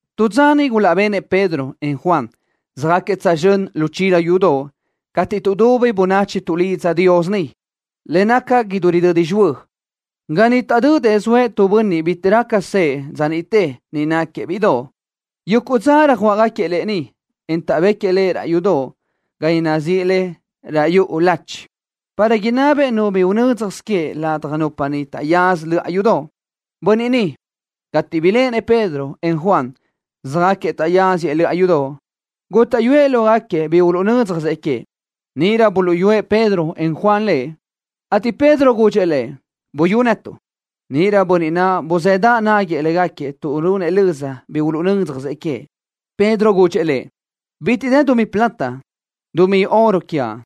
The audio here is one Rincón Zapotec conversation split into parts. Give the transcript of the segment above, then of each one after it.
Tu dza niʼ gulaʼbenëʼ Pedro, en Juan, söjáquiëʼ tsözxö́n lu chila yudoʼ, cateʼ tuʼdubi bönachi tuʼlidza Dios niʼ, le naca idú ridödi xihuö́. Ga niʼ taʼdödëʼ zoëʼ tu bönniʼ bitiʼ raca sëʼë dza niʼte niʼ náquiëʼ bíʼidoʼ. Yuguʼ dza röjuáʼgaquiëʼ lëʼ niʼ, en taʼbéquiëʼ lëʼ raʼ yudoʼ ga nazíʼi le Raʼ Yuʼu Lachi, para inábinëʼ nu bi unö́dzjasö queëʼ ladaj nupa niʼ taʼyaza löʼa yudoʼ. Bönniʼ ni, cateʼ biléʼenëʼ Pedro, en Juan, söjáquiëʼ taʼyáziëʼ löʼa yudoʼ, gútaʼyuëʼ lógaquiëʼ bi uluʼnö́dzjasëʼ queëʼ. Níʼirö buluʼyúëʼ Pedro, en Juan lëʼ, ateʼ Pedro gudxëʼ lëʼ: —Buyú netuʼ. Níʼirö bönniʼ naʼ buzëdaʼ náguiëʼ légaquiëʼ tuʼ runëʼ löza bi uluʼnö́dzjasëʼ queëʼ. Pedro gudxëʼ lëʼ: —Bitiʼ dë dumí plata, dumí oro quiaʼ,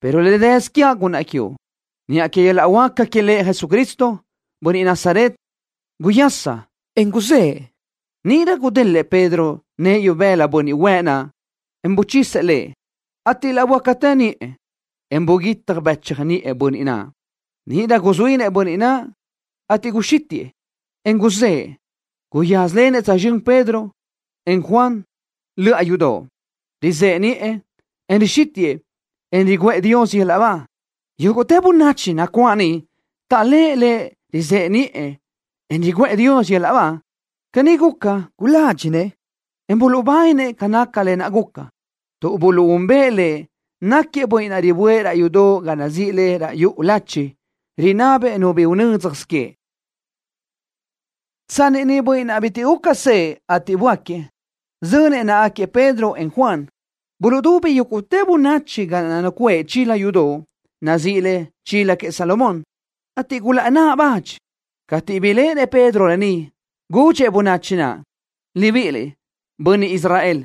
pero le dësö quiaʼ gunnaʼ quiuʼ. Niʼa que yöl-laʼ huáca que Lëʼ Jesucristo, bönniʼ Nazaret, guyasa, en guzëʼe. Níʼirö gudélëʼë Pedro nëʼë ibëla bönniʼ huëʼ naʼ, en buchisëʼ lëʼ, ateʼ laʼ böácatë niʼë, en buguitaj bëchaj niʼë bönniʼ naʼ. Níʼirö guzuínëʼ bönniʼ naʼ, ateʼ guxítiʼë, en guzë́ʼë. Guyázalenëʼ tsözxö́n Pedro, en Juan, löʼa yudoʼ, rizëʼe niʼë, en rixítiʼë, en riguʼë Dios yöl-laʼ ba. Yúguʼtë bönachi nacuáʼ niʼ taʼléʼe lëʼ rizëʼe niʼë, en riguʼë Dios yöl-laʼ ba. Caní guca, guládxinëʼ, en buluʼbáninë ca naca lë naʼ guca, tuʼ buluʼúnbëʼë lëʼ, náquiëʼ bönniʼ naʼ riböʼë raʼ yudoʼ ga nazíʼi le Raʼ Yuʼu Lachi, rinabëʼ nu bi unö́dzjasö queëʼ. Tsanni niʼ bönniʼ naʼ bitiʼ guca sëʼë, ateʼ böáquiëʼ, zönëʼ náʼagaquiëʼ Pedro, en Juan, buluʼdubi yúguʼtë bönachi ga naʼ nacuʼë chila yudoʼ nazíʼi le: Chila Queëʼ Salomón, ateʼ gulaʼnáʼ badxëʼ. Cateʼ biléʼenëʼ Pedro lë ni, gudxëʼ bönachi naʼ: —Libiʼiliʼ, bönniʼ Israel,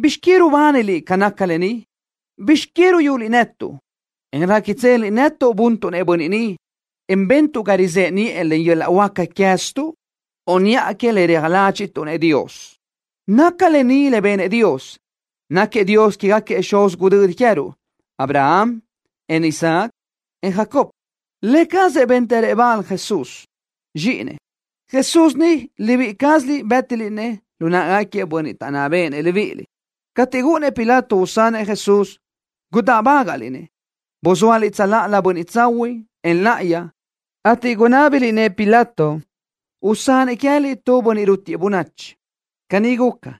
¿bizx que rubániliʼ ca naca lë ni? ¿Bizx que ruyuliʼ netuʼ, en réquitseliʼ nétuʼsö buntuʼ-nëʼ bönniʼ ni, en bentuʼ ga rizëʼe niʼë len yöl-laʼ huáca queë́ztuʼ, o niʼa que le reaj ládxiʼtuʼ-nëʼ Dios? Naca lë ni le benëʼ Dios. Náquiëʼ Dios quégaquiëʼ xuz gudödi queë́ruʼ Abraham, en Isaac, en Jacob. Lë cazëʼ béntërëʼ bal Jesús, Zxíʼinëʼ. Jesús ni, libíʼi cázaliʼ bë́tiliʼ-nëʼ lu náʼagaquiëʼ bönniʼ taʼnná béʼenëʼ libíʼiliʼ. Cateʼ gúʼunnëʼ Pilato usanëʼ Jesús, gudáʼbagaʼliʼ-nëʼ. Buzóaliʼ tsöláʼalö Bönniʼ Tsahuiʼ, en Láʼayi, ateʼ gunábiliʼ-nëʼ Pilato usanëʼ queë́liʼ tu bönniʼ rútiëʼ bönachi. Caní guca,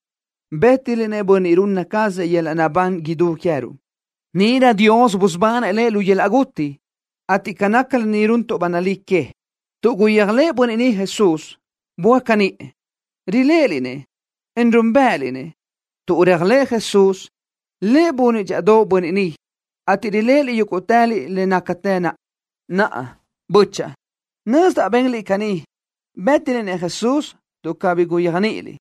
bë́tiliʼ-nëʼ Bönniʼ runna cazëʼ yöl-laʼ naʼbán idú queë́ruʼ. Níʼirö Dios busubanëʼ Lëʼ lu yöl-laʼ guti, ateʼ ca naca lë ni runtuʼ ba nalí que. Tuʼ guyéajlëʼë bönniʼ ni Jesús, böáca niʼë. Riléʼeliʼ-nëʼ, en núnbëʼëliʼ-nëʼ. Tuʼ réajlëʼë Jesús, Lëʼ bunëʼ dxíʼadoʼ bönniʼ ni, ateʼ riléʼeliʼ yúguʼtëliʼ le nácatë naʼ. ’Naʼa, bö́chaʼa, nözdaʼ benliʼ caní, bë́tiliʼ-nëʼ Jesús tuʼ cabí guyéajniʼiliʼ,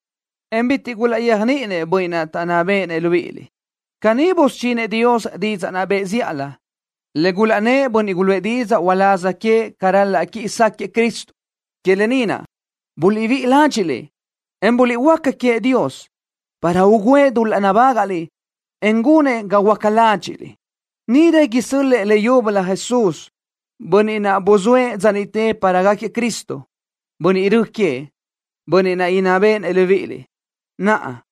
en bitiʼ gulaʼyéajniʼinëʼ bönniʼ taʼnná béʼenëʼ libíʼiliʼ. Caní busudxinëʼ Dios didzaʼ naʼ bëʼë zíʼalö, le gulaʼnnë́ʼ bönniʼ guluʼë didzaʼ uláz queëʼ ca ral-laʼ quiʼi sáquëʼë Cristo. Que lë ni naʼ, buliʼbíʼi ládxiʼliʼ, en buliʼhuöáca queëʼ Dios, para ugǘëʼ dul-laʼ nabágaʼliʼ, en gunëʼ ga huöáca ládxiʼliʼ. Níʼirö isö́l-lëʼë leyúbölö Jesús, Bönniʼ naʼ buzóëʼ dza niʼte para gáquiëʼ Cristo, Bönniʼ Rö queëʼ, Bönniʼ naʼ inná béʼenëʼ libíʼiliʼ. Naʼa,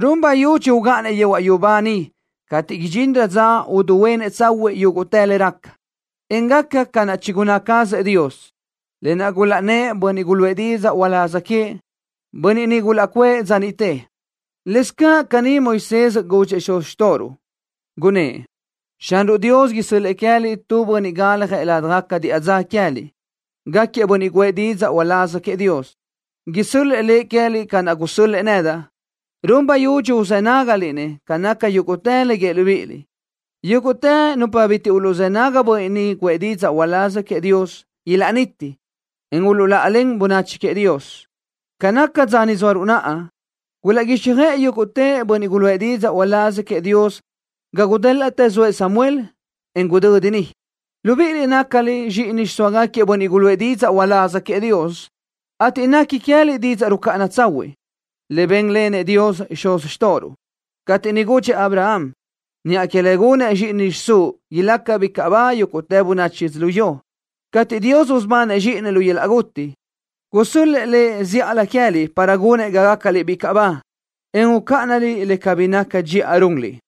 run bayudxi ugáʼanëʼ yehuaʼ yubá niʼ cateʼ idxinrö dza uduhuénëʼ tsahuiʼ yúguʼtë le raca, en gaca ca naʼ chigunná cazëʼ Dios, lë naʼ gulaʼnnë́ʼ bönniʼ guluʼë didzaʼ uláz queëʼ, bönniʼ niʼ gulaʼcuʼë dza niʼte. Lëscaʼ caní Moisés gudxëʼ xuz xtóʼoruʼ, gunnë́ʼ: “Xanruʼ Dios isö́l-lëʼë queë́liʼ tu bönniʼ galjëʼ ládjagaca diʼa dza queë́liʼ. Gáquiëʼ bönniʼ guʼë didzaʼ uláz queëʼ Dios. Isö́l-lëʼë Lëʼ queë́liʼ ca naʼ gusö́l-lëʼë nedaʼ. Run bayudxi uzë́ nágaliʼ-nëʼ ca naca yúguʼtë le guíëʼ libíʼiliʼ. Yúguʼtë nupa bitiʼ uluʼzë́ nágagaca bönniʼ niʼ guʼë didzaʼ uláz queëʼ Dios ilaʼniti, en uluʼláʼalen bönachi queëʼ Dios.” ’Ca naca dza ni zóaruʼ naʼa, gulaʼguíxjöʼë yúguʼtë bönniʼ guluʼë didzaʼ uláz queëʼ Dios ga gudélaʼtë zoëʼ Samuel, en gudödi niʼ. Libíʼiliʼ nácaliʼ zxíʼini xiʼsóagaquiëʼ bönniʼ guluʼë didzaʼ uláz queëʼ Dios, ateʼ nequi queë́liʼ didzaʼ rucáʼana tsahuiʼ, le bénlenëʼ Dios xuz xtóʼoruʼ, cateʼ niʼ gudxëʼ Abraham: “Niʼa que le gunëʼ zxíʼini xiʼsúʼ ilaca bicaʼ ba yúguʼtë bönachi yödzölió.” Cateʼ Dios busubanëʼ Zxíʼinëʼ lu yöl-laʼ guti, gusö́l-lëʼë Lëʼ zíʼalö queë́liʼ para gunëʼ ga gácaliʼ bicaʼ ba, en ucáʼanaliʼ le cabí naca dxiʼa runliʼ.